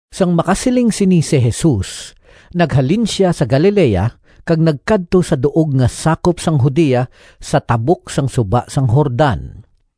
Sang makasiling sini si Jesus, naghalin sia sa Galilea kag nagkadto sa duog nga sakop sang Judea sa tabok sang suba sang Jordan.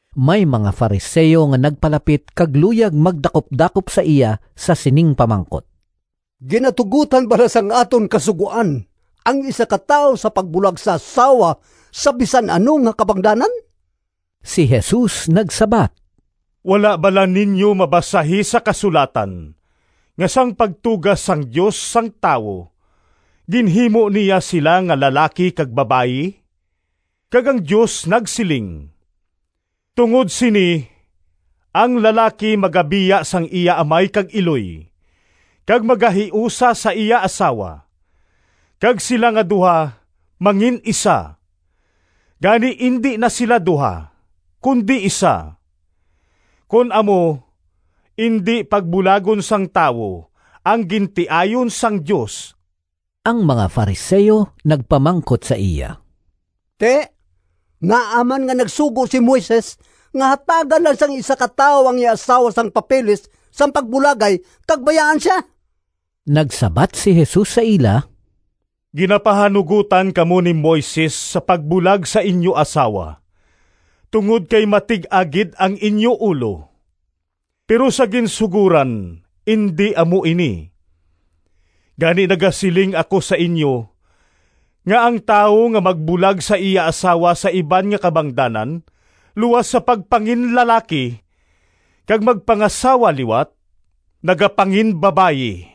May mga Fariseo nga nagpalapit kag luyag magdakupdakop sa iya sa sining pamangkot, “Ginatugotan bala sang aton Kasugoan ang isa ka tawo sa pagbulag sa asawa sa bisan ano nga kabangdanan?” Si Jesus nagsabat, “Wala bala ninyo mabasahi sa kasulatan nga sang pagtuga sang Dios sang tawo ginhimo niya sila nga lalaki kag babayi? Kag ang Dios nagsiling, ‘Tungod sini ang lalaki magabiya sang iya amay kag iloy, kag magahiusa sa iya asawa, kag sila nga duha mangin-isa.’ Gani indi na sila duha, kundi isa. Kon amo, indi pagbulagon sang tawo ang gintiayon sang Dios.” Ang mga Fariseo nagpamangkot sa iya, “Ti, ngaa man nga nagsugo si Moises nga hatagan lang sang isa ka tawo ang iya asawa sang papeles sang pagbulagay kag bayaan sia?” Nagsabat si Jesus sa ila, “Ginapahanugotan kamo ni Moises sa pagbulag sa inyo asawa tungod kay matig-a gid ang inyo ulo. Pero sa ginsugoran indi amo ini. Gani nagasiling ako sa inyo nga ang tawo nga magbulag sa iya asawa sa iban nga kabangdanan luas sa pagpanginlalaki, kag magpangasawa liwat, nagapanginbabayi.”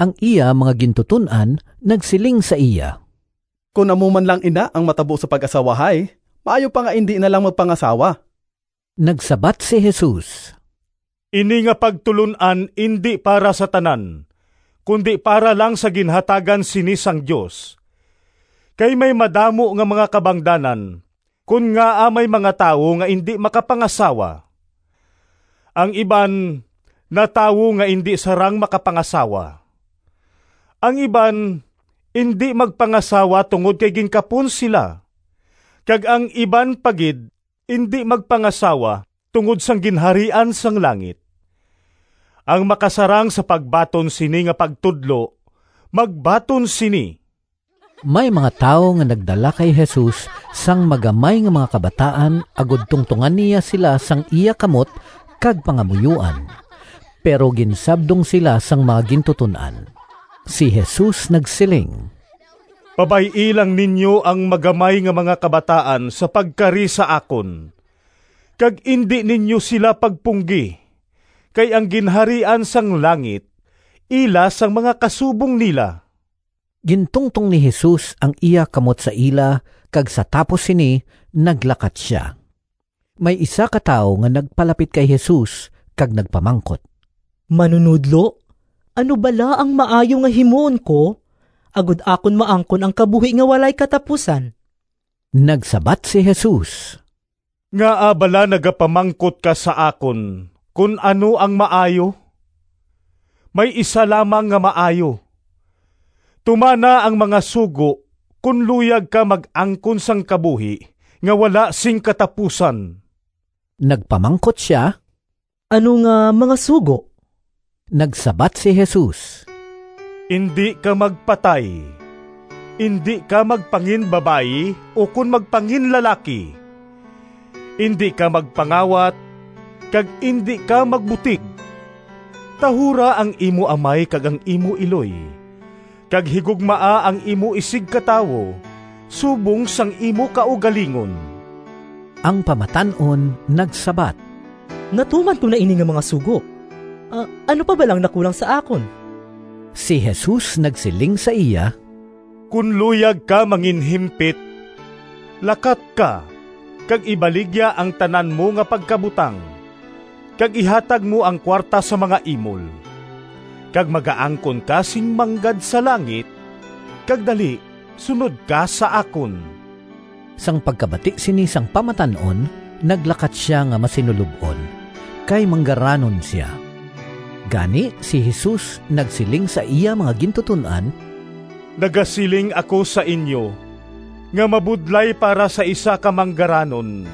Ang iya mga gintuton-an nagsiling sa iya, “Kon amo man lang ina ang matabo sa pag-asawahay, maayo pa nga indi na lang magpangasawa.” Nagsabat si Jesus, “Ini nga pagtulon-an indi para sa tanan, kundi para lang sa ginhatagan sini sang Dios. Kay may madamo nga mga kabangdanan kon ngaa may mga tawo nga indi makapangasawa: ang iban natawo nga indi sarang makapangasawa; ang iban indi magpangasawa tungod kay ginkapon sila; kag ang iban pa gid indi magpangasawa tungod sang Ginharian sang langit. Ang makasarang sa pagbaton sini nga pagtudlo magbaton sini.” May mga tawo nga nagdala kay Jesus sang magamay nga mga kabataan agod tungtongan niya sila sang iya kamot kag pangamuyoan, pero ginsabdong sila sang mga gintuton-an. Si Jesus nagsiling, “Pabay-i lang ninyo ang magamay nga mga kabataan sa pagkari sa akon, kag indi ninyo sila pagpunggi, kay ang Ginharian sang langit ila sang mga kasubong nila.” Gintungtong ni Jesus ang iya kamot sa ila kag sa tapos sini naglakat sia. May isa ka tawo nga nagpalapit kay Jesus kag nagpamangkot, “Manunodlo, ano bala ang maayo nga himuon ko agod akon maangkon ang kabuhi nga walay katapusan?” Nagsabat si Jesus, “Ngaa bala nagapamangkot ka sa akon kon ano ang maayo?” May Isa lamang nga maayo. Tumana ang mga sugo kon luyag ka mag-angkon sang kabuhi nga wala sing katapusan. Nagpamangkot sia, “Ano nga mga sugo?” Nagsabat si Jesus, “Indi ka magpatay, indi ka magpanginbabayi ukon magpanginlalaki, indi ka magpangawat, kag indi ka magbutig. Tahura ang imo amay kag ang imo iloy, kag higugmaa ang imo isigkatawo subong sang imo kaugalingon.” Ang pamatan-on nagsabat, “Natuman ko na ini nga mga sugo. Ano pa bala ang nakulang sa akon?” Si Jesus nagsiling sa iya, “Kon luyag ka nga manginhimpit, lakat ka kag ibaligya ang tanan mo nga pagkabutang kag ihatag mo ang kuwarta sa mga imol, kag magaangkon ka sing manggad sa langit kag dali sunod ka sa akon.” Sang pagkabati sini sang pamatan-on, naglakat sia nga masinulob-on, kay manggaranon sia. Gani si Jesus nagsiling sa iya mga gintuton-an, “Nagasiling ako sa inyo nga mabudlay para sa isa ka manggaranon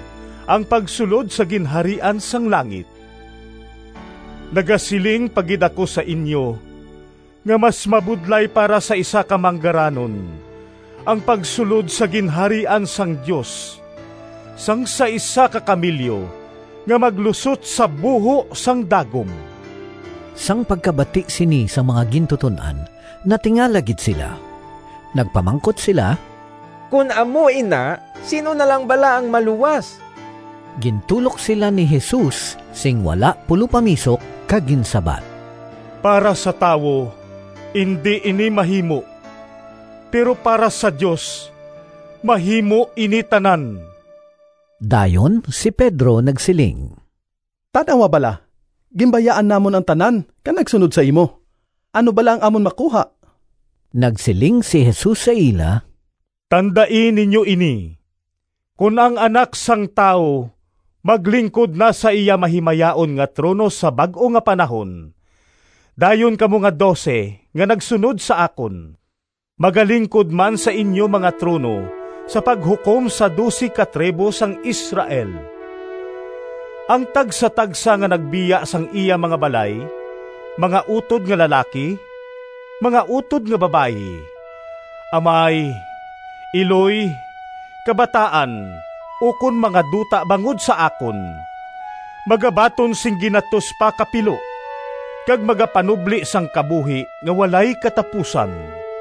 ang pagsulod sa Ginharian sang langit. Nagasiling pa gid ako sa inyo nga mas mabudlay para sa isa ka manggaranon ang pagsulod sa Ginharian sang Dios sang sa isa ka kamelyo nga maglusot sa buho sang dagom.” Sang pagkabati sini sang mga gintuton-an natingala gid sila. Nagpamangkot sila, “Kon amo ina, sin-o na lang bala ang maluwas?” Gintulok sila ni Jesus sing wala pulopamisok kag ginsabat, “Para sa tawo indi ini mahimo, pero para sa Dios mahimo ini tanan.” Dayon si Pedro nagsiling, “Tan-awa bala, ginbayaan namon ang tanan kag nagsunod sa imo. Ano bala ang amon makuha?” Nagsiling si Jesus sa ila, “Tandai ninyo ini! Kon ang Anak sang Tawo maglingkod na sa iya mahimayaon nga trono, sa Bag-o nga Panahon, dayon kamo nga dose nga nagsunod sa akon magalingkod man sa inyo mga trono sa paghukom sa dose ka tribo sang Israel. Ang tagsatagsa nga nagbiya sang iya mga balay, mga utod nga lalaki, mga utod nga babayi, amay, iloy, kabataan, ukon mga duta bangod sa akon, magabaton sing ginatos pa ka pilo, kag magapanubli sang kabuhi nga walay katapusan.